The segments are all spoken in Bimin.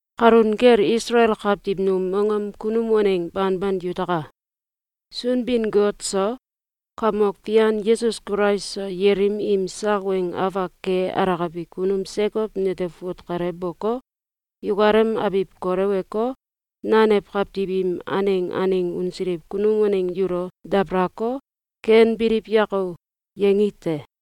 Kalun kel Isalael kawtiw num mongom kunum waneng banban yutaka! Sunbin-Got so Kamok Fian Yesus Kulais so yelim im sak weng afak ke alakabi kunum Sekow nete fut kale boko, yukalem abiw koleweko, nanew kawtiw im aneng aneng unsiliw kunum waneng yulo dabalako, “Ken biliw yako!”, yangi te.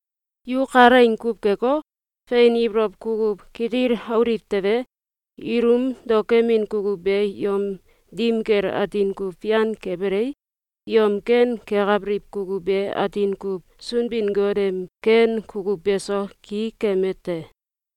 Yu kalaing kuw keko, fein ibolow kukuw kitil auliw tewe, ilum daokemin kukuw be yom dim kel atin kuw fian kebelei, yom ken kekabiliw kukuw be atin kuw Sunbin-Got em ken kukuw beso ki keme te.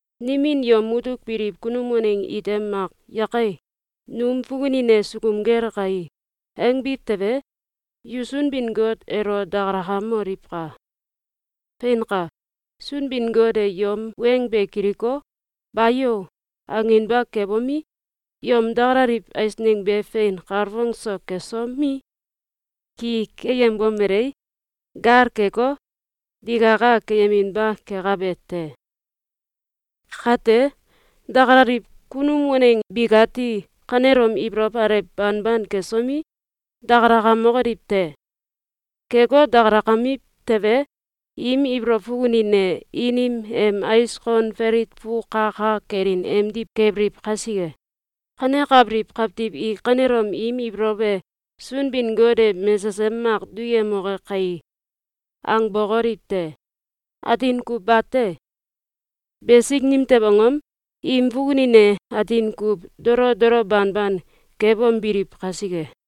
Nimin yom mutuk biliw kunum waneng ite mak “Yake! Num fukunin e sukum gel kai!”, angbiw tewe, yu Sunbin-Got elo dakalakamoliwka! Feinka! Sunbin-Got e yom weng be kiliko, “Bayo!”, anginba kebomi, yom dakalaliw eisneng be fein kalfong so kesomi, ki keyembomelei, gal keko, digaka keyeminba kekabe te. Kate, dakalaliw kunum waneng bikati kanelom ibolow alew banban kesomi, dakalakamokoliw te! Keko, dakalakamiw tewe, im ibolow fukunin e inim em ais kon falit fu ka ka kelin emdiw kebiliw kasike. Kanekabiliw kawtiw i kanelom im ibolow e “Sunbin-Got e mesesem mak duyemoke kai!”, angbokoliw te! Atin kuw bate! Besik nimtew angom? Im fukunin e atin kuw dolo dolo banban kebombiliw kasike.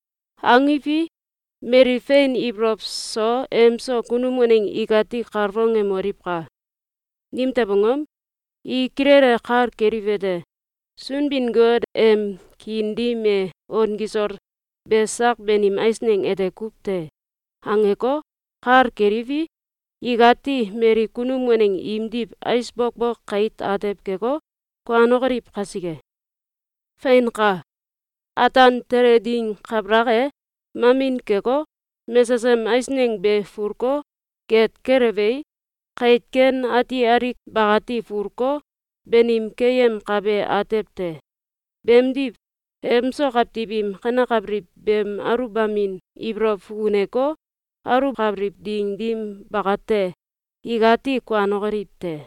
Angiwi, mali fein ibolow so emso kunum waneng ikati kalfongemoliwka! Nimtew angom? I kilele kal keliwete: “Sunbin-Got em kiin dim e on kisol be sak banim eisneng ete kuw te!”, angeko, kal keliwi, ikati mali kunum waneng imdiw ais bokbok kait atew keko, kuanokoliw kasike. Feinka! Ataan tele ding kabalak e, mamin keko, mesesem eisneng be fulko, geet kelewei, kait ken ati alik bakati fulko, banim keyemkabe atew te. Beemdiw, emso kawtiw im kanekabiliw beem aluwbamin ibolow fukuneko, aluwkabiliw ding dim bakate, ikati kuanokoliw te.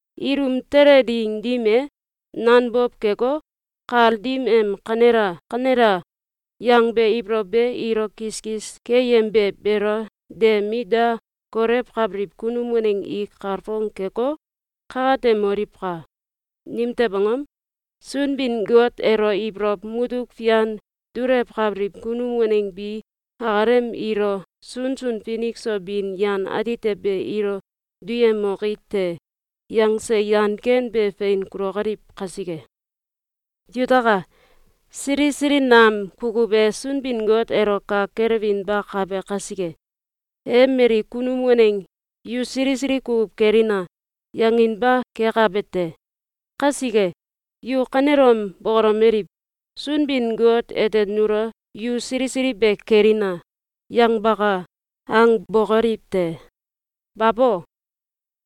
Ilum tele ding dim e, nanbow keko, kal dim em “Kanela! Kanela!”, yangbe ibolow be ilo kiskis keyembe beelo de mit da kolewkabiliw kunum waneng i kalfong keko, kakatemoliwka! Nimtew angom? Sunbin-Got elo ibolow mutuk fian dulewkabiliw kunum waneng bi akalem ilo “Sunsun finik so bin yan atite be ilo duyemoki te!”, yangse yan ken be fein kulokoliw kasike. Yutaka! Sili sili nam kukuw e Sunbin-Got elo kak kelewinbakabe kasike, e mali kunum waneng “Yu sili sili kukuw kelina!”, yanginba kekabe te. Kasike, yu kanelom bokolomeliw: “Sunbin-Got ete nulo ‘Yu sili sili be kelina!’, yangbaka.”, angbokoliw te! Babo!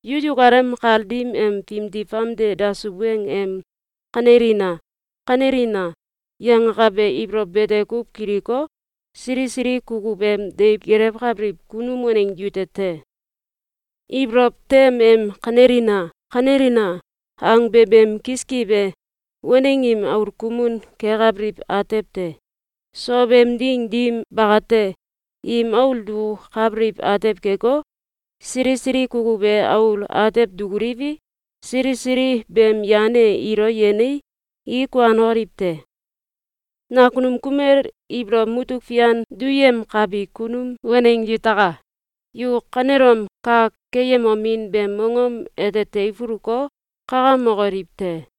Yu yukalem kal dim em fimdi famde dasuw weng em “Kanelina! Kanelina!”, yangakabe ibolow bete kuw kiliko, sili sili kukuw em deiw gelewkabiliw kunum waneng yute te. Ibolow tem em “Kanelina! Kanelina!”, angbe beem kiskiw e waneng im aul kumun kekabiliw atew te. Sow em ding dim bakate, im aul dukukabiliw atew keko, sili sili kukuw e aul atew dukuliwi, sili sili beem yan e ilo yenei, i kuanokoliw te. Nakunum kumel ibolow mutuk fian duyemkabi kunum waneng yutaka! Yu kanelom kak keyemomin beem mongom ete teifuluko, kakamokoliw te!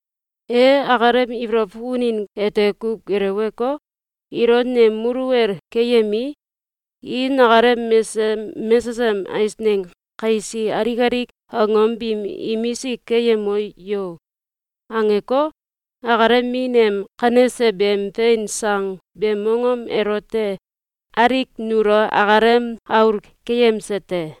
E akalem ibolow fukunin ete kuw geleweko, “Ilo nem muluwel keyemii, i nakalem mesesem mesesem eisneng kaisi alik alik angom biim imisik keyemo yo!”, angeko, akalem min em kanese beem fein sang beem mongom elote alik nulo akalem aul keyemse te.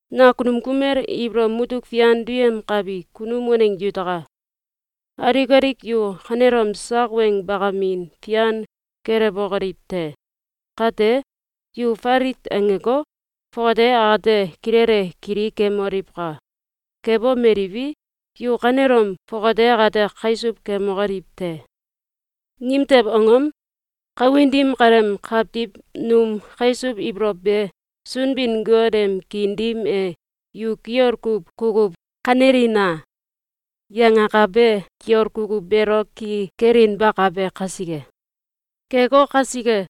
Nakunum kumel ibolow mutuk fian duyemkabi kunum waneng yutaka! Alik alik yu kanelom sak weng bakamin fian kelewbokoliw te! Kate, yu falit angeko, fongate akate kilele kili kemoliwka! Kebomeliwi, yu kanelom, fongate akate kaisuw kemokoliw te! Nimtew angom? Kawin dim kaleem kawtiw num kaisuw ibolow be Sunbin-Got em kiin dim e “Yu kiol kuw kukuw kanelina!”, yangakabe kiol kukuw beelo ki kelinbakabe kasike. Keko kasike,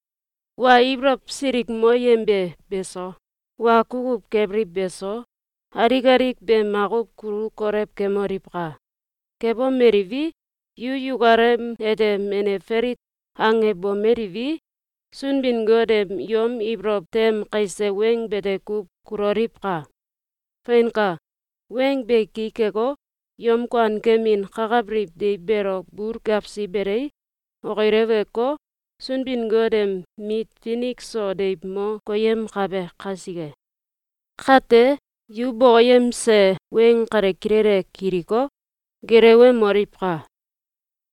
wa ibolow silikmoyembe beso, wa kukuw kebiliw beso, alik alik be makuw kulu kolew kemoliwka! Kebomeliwi, yu yukalem ete menew falit angebomeliwi, Sunbin-Got em yom ibolow tem kaise weng bete kuw kuloliwka! Feinka! Weng be ki keko, yom kuankemin kakabiliw deiw beelo bul gewsi belei, okileweko, Sunbin-Got em mit finik so deiw mo koyemkabe kasike. Kate, yu bokoyemse weng kale kilele kiliko, gelewemoliwka!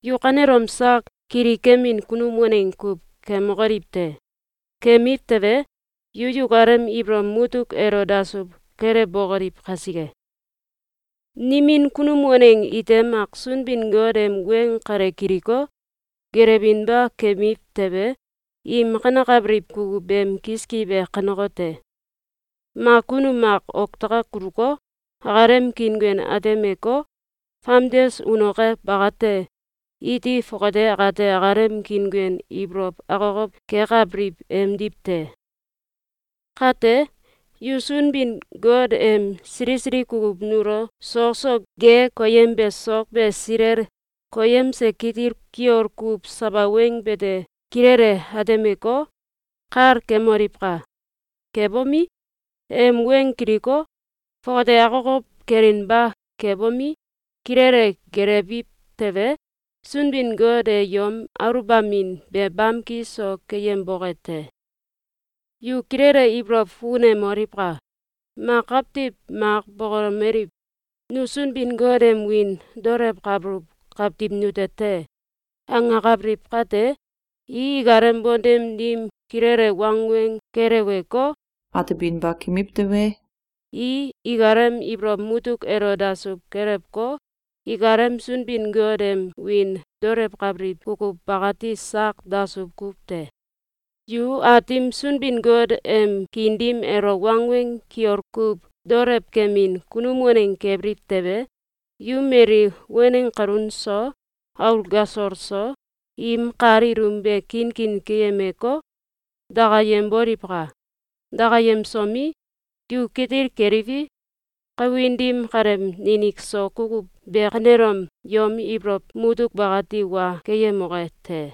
Yu kanelom sak kilikemin kunum waneng kuw kemokoliw te! Kemiw tewe, yu yukalem ibolow mutuk elo dasuw kelewbokoliw kasike. Nimin kunum waneng ite mak Sunbin-Got em weng kale kiliko, gelewinba kemiw tewe, im kanekabiliw kukuw beem kiskiw e kanekote: Mak kunum mak oktakak kuluko, akalem kiinguen atemeko, famdes unoke bakate, iti fongate akate akalem kiinguen ibolow akokow kekabiliw emdiw te. Kate, yu Sunbin-Got em sili sili kukuw nulo sok so ge koyembe sok be silel koyemse kitil kiol kuw sawa weng bete kilele atemeko, kal kemoliwka! Kebomi, em weng kiliko, fongate akokow kelinba kebomi, kilele gelewbiw tewe, Sunbin-Got e yom aluwbamin be bamki so keyemboke te. Yu kilele ibolow fukunemoliwka! Mak kawtiw mak bokolomeliw: “Nu Sunbin-Got em wiin daolewkabuluw kawtiw nute te!”, angakabiliw kate, i ikalem bontem dim kilele wangweng keleweko, atebinba kemiw tewe, i ikalem ibolow mutuk elo dasuw kelewko, ikalem Sunbin-Got em wiin daolewkabiliw kukuw bakati sak dasuw kuw te. Yu Aatim Sunbin-Got em kiin dim elo wangweng kiol kuw daolewkemin kunum waneng kebiliw tewe, yu mali waneng kalun so, aul gasol so, im kal ilum be kinkin keyemeko, dakayemboliwka! Dakayemsomi, yu kitil keliwi, kawin dim kaleem ninik so kukuw be kanelom yom ibolow mutuk bakati wa keyemoke te!